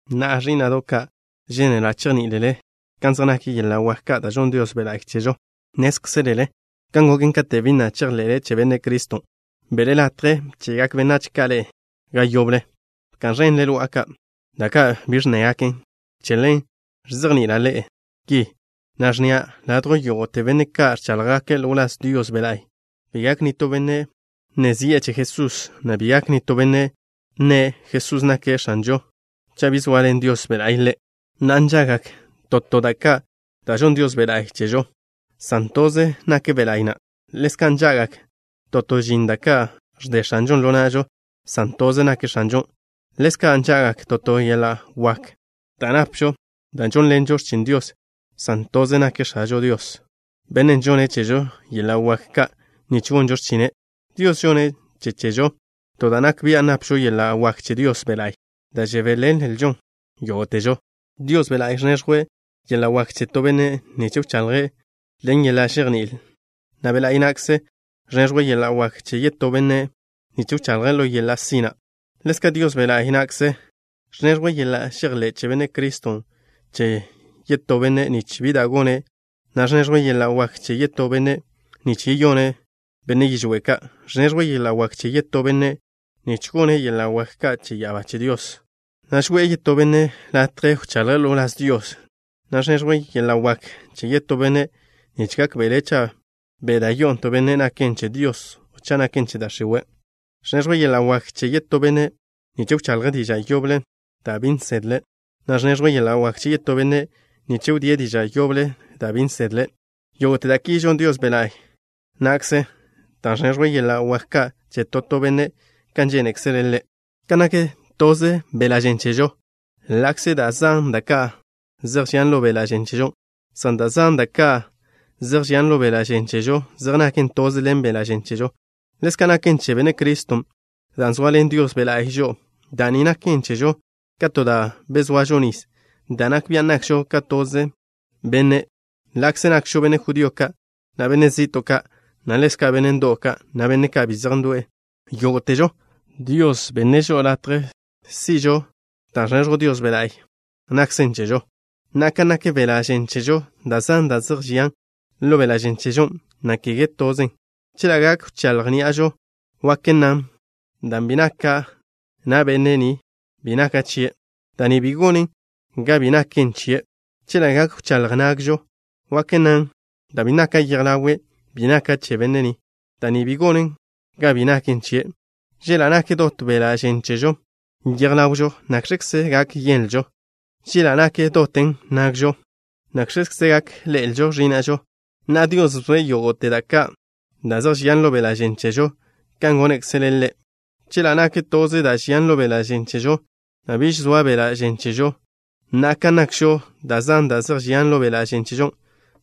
Na'a, ẕí'na'do' ka', žénela' chejní'ilele kan zej nak yeḻa' wak ka' da' žonn Dios Be' La'y chežo. Nnézkzelele kan goken katen' bi na' chejḻe'le che Benne' Criston', be'le latje bche'gak benách ka' ḻe'e ga yoble. Bka'n ẕenle lo'a ka', da' ka' bi ẕnnégaken. Che ḻen, ẕzejni'ila' ḻe'e ki, na' ẕnnia': ladjw yógo'te benne' ka' ẕcháḻjgake' ḻo wláz Dios Be' La'y, bi gak nitó benne' nne zi'e che Jesús, na' bi gak nitó benne' nne': “Jesús nake' X̱anžo” cha' bi zoaḻen Dios Be' La'y ḻe'. Na'a, nža'gak to to da' ka' da' žonn Dios Be' La'y chežo, san toze nak Be' La'y na'. Ḻezka', nža'gak to to žin ka' da' ẕde X̱anžon' ḻo na'žo, san toze nak X̱anžon'. Ḻezka' nža'gak to to yeḻa' wak ka' da' napžo da' žónḻenžo x̱chin Dios, san toze nak X̱ažo Dios, Bennen' žonne' chežo yeḻa' wak ka' nich gonžo x̱chine'. Dios žonne' che chežo to da' nak bian' napžo yeḻa' wak che Dios Be' La'y, da' žebéḻenlžon yógo'težo. Dios Be' La'y ẕneẕjwe' yeḻa' wak che to benne' nich wchaḻje' ḻen yeḻa' žejní'il, na' Be' La'y na'kze ẕneẕjwe' yeḻa' wak che yetó benne' nich wchaḻje' ḻo yeḻa' sina'. Ḻezka', Dios Be' La'y na'kze ẕneẕjwe' yeḻa' žejḻé' che Benne' Criston' che yetó benne' nich bi da' gone', na' ẕneẕjwe' yeḻa' wak che yetó benne' nich yeyone' benne' yižwé' ka'. Ẕneẕjwe' yeḻa' wak che yetó benne' nich gone' yeḻa' wak ka' che ya'abá che Dios, na' žoe'e yetó benne' latje wchaḻje' ḻo wláz Dios, na' ẕneẕjwe' yeḻa' wak che yetó benne' nich gákbe'le' cha' be' da' yo'o to benne' naken che Dios o cha' naken che da' x̱iwe'. Ẕneẕjwe' yeḻa' wak che yetó benne' nich wchaḻje' diža' yoble da' bi nsedle', na' ẕneẕjwe' yeḻa' wak che yetó benne' nich wdíe' diža' yoblen' da' bi nsedle'. Yógo'te da' ki žon Dios Be' La'y na'kze, dan' ẕneẕjwe' yeḻa' wak ka' che to to benne' kan žénekzele' Ḻe'. Kan nak toze beḻa' žen chežo, ḻa'kze da' zan da' ka' zej žian ḻo beḻa' žen chežo, san da' zan ka' da' zej žian ḻo beḻa' žen chežo zej naken toze ḻen beḻa' žen chežo, ḻezka' naken che Benne' Criston'. Dan' zoaḻen Dios Be' La'y žo'o, da' ni naken chežo ka to da' bezoažo nis, da' nak bian' nakžo ka toze benne', ḻa'kze nakžo benne' judío ka', na' benne' zi'to' ka', na' ḻezka' benne' ndo'w ka', na' benne' ka' bi zej ndo'e. Yógo'težo, Dios bi'e žo'o latje si'žo da' ẕneẕjw Dios Be' la'y na'kze chežo. Na'a, ka nak beḻa' žen chežo, da' zan da' zej žian ḻo beḻa' žen chežo, na' kege tozen. Chela' gak wcháḻj ní'ažo, wak nnan: “Dan' bi naka' na' benne' ni, bi naka' chie'” da' ni bi gonen ga bi naken chie'. Chela' gak wcháḻj nagžo, wak nnan: “Dan' bi naka' yej ḻawe', bi naka' che benne' ni” da' ni bi gonen ga bi naken chie'. Chela' nak dot beḻa' žen chežo yej ḻawžo, ¿nakx̱kze gak yenlžo? Chela' nak doten nagžo, ¿nakx̱kze gak ḻe'el ẕína'žo? Na'a, Dios bzoe' yógo'te da' ka' da' zej žian ḻo beḻa' žen chežo kan gónekzele' Ḻe'. Chela' nak toze da' žian ḻo beḻa' žen chežo, na' biž soa beḻa' žen chežo. Na'a, kan nakžo, da' zan da' zej žian ḻo beḻa' žen chežo,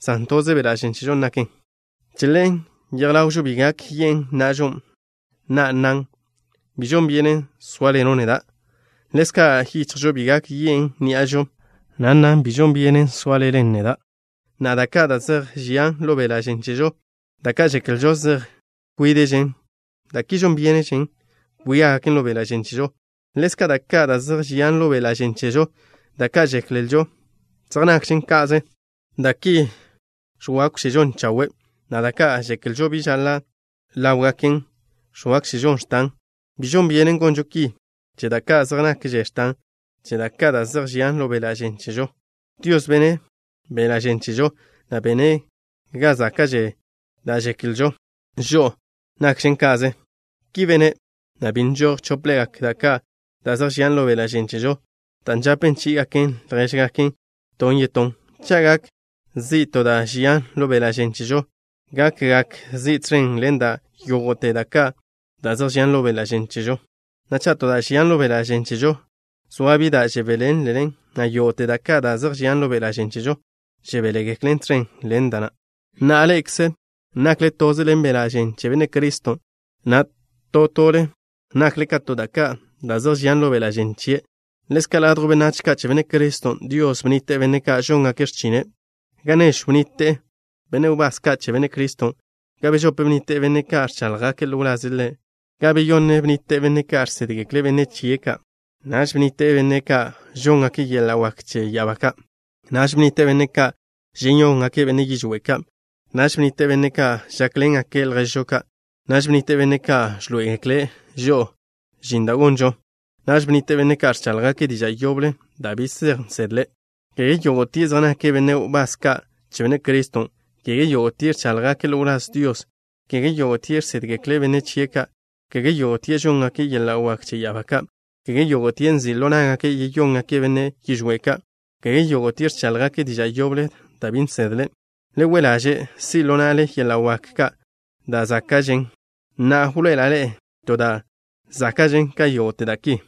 san toze beḻa' žen nakžo. Che ḻen, yej ḻawžo bi gak yen' na'žo, na' nnan: “Bi žon byenen sóaḻeno' neda'.” Ḻezka', yichjžo bi gak yen' ní'ažo, na' nnan: “Bi žon byenen sóaḻenle neda'.” Na'a, da' ka' da' zej žian ḻo beḻa' žen chežo, da' ka' žeklžo zej nkwíde'žen, da' ki žon byénežen kwiágaken ḻo beḻa' žen chežo. Ḻezka', da' ka' da' zej žian ḻo beḻa' žen chežo, da' ka' žeklžo zej nakžen ka'ze, da' ki ẕwákwžežon chawe', na' da' ka' žeklžo bi žaḻa' ḻa' ḻáwgaken, ẕwákwžežon x̱tan. Bi žon byenen gonžo ki che da' ka' zej nakže x̱tan che da' ka' da' zej žian ḻo beḻa' žen chežo. Dios bene' beḻa' žen chežo, na' bene' ga záka'že da' žeklžo žo'o nakžen ka'ze. Ki bene', na' bi nžoj chóplegak da' ka' da' zej žian ḻo beḻa' žen chežo, dan' žape chí'igaken ljéžgaken ton yetón. Cha' gak zi' to da' žian ḻo beḻa' žen chežo, gakgak zi' tẕen ḻen dan' yógo'te da' ka' da' zej žian ḻo beḻa' žen chežo, na' cha' to da' žian ḻo beḻa' žen chežo, zoa bi da' žebéḻenlen, na' yógo'te da' ka' da' zej žian ḻo beḻa' žen chežo žebéḻengeklen tẕen ḻen dan'. Na'a, ḻe'ekze nakle toze ḻen beḻa' žen che Benne' Criston', na' to tole nakle ka to da' ka' da' zej žian ḻo beḻa' žen chien'. Ḻezka', ladjw benách ka' che Benne' Criston', Dios bnnite' benne' ka' žóngake' x̱chine'. Ga nežw bnnite' benne' wbás ka' che Benne' Criston'. Ga bežope bnnite' benne' ka' ẕcháḻjgake' ḻo wlaze' Ḻe'. Ga beyonne bnnite' benne' ka' žsédgekle' benne' chie' ka'. Naž bnnite' benne' ka' žóngake' yeḻa' wak che ya'abá ka'. Naž bnnite' benne' ka' žeyóngake' benne' yižwé' ka'. Naž bnnite' benne' ka' žákḻengake' lježžo ka'. Naž bnnite' benne' ka' ẕḻoé'egekle' žo'o žin da' gonžon. Naž bnnite' benne' ka' ẕcháḻjgake' diža' yoble da' bi zej nsedle'. Kege yógo'tie' zej nake' benne' wbás ka' che Benne' Criston'. Kege yógo'tie' ẕcháḻjgake' ḻo wláz Dios. Kege yógo'tie' žsédgekle' benne' chie' ka'. Kege yógo'tie' žóngake' yeḻa' wak che ya'abá ka'. Kege yógo'tie' nzi' ḻo ná'gake' yeyóngake' benne' yižwé' ka'. Kege yógo'tie' ẕcháḻjgake' diža' yoble da' bi zej nsedle'. Kege yógo'tie' ẕdégake' diža' yoble da' bi zej nsedle'. Le we' ḻaže' si' ḻo na'le yeḻa' wak ka' da' záka'gakžen. Na'a, wḻoe'ela' ḻe'e to da' záka'žen ka yógo'te da' ki.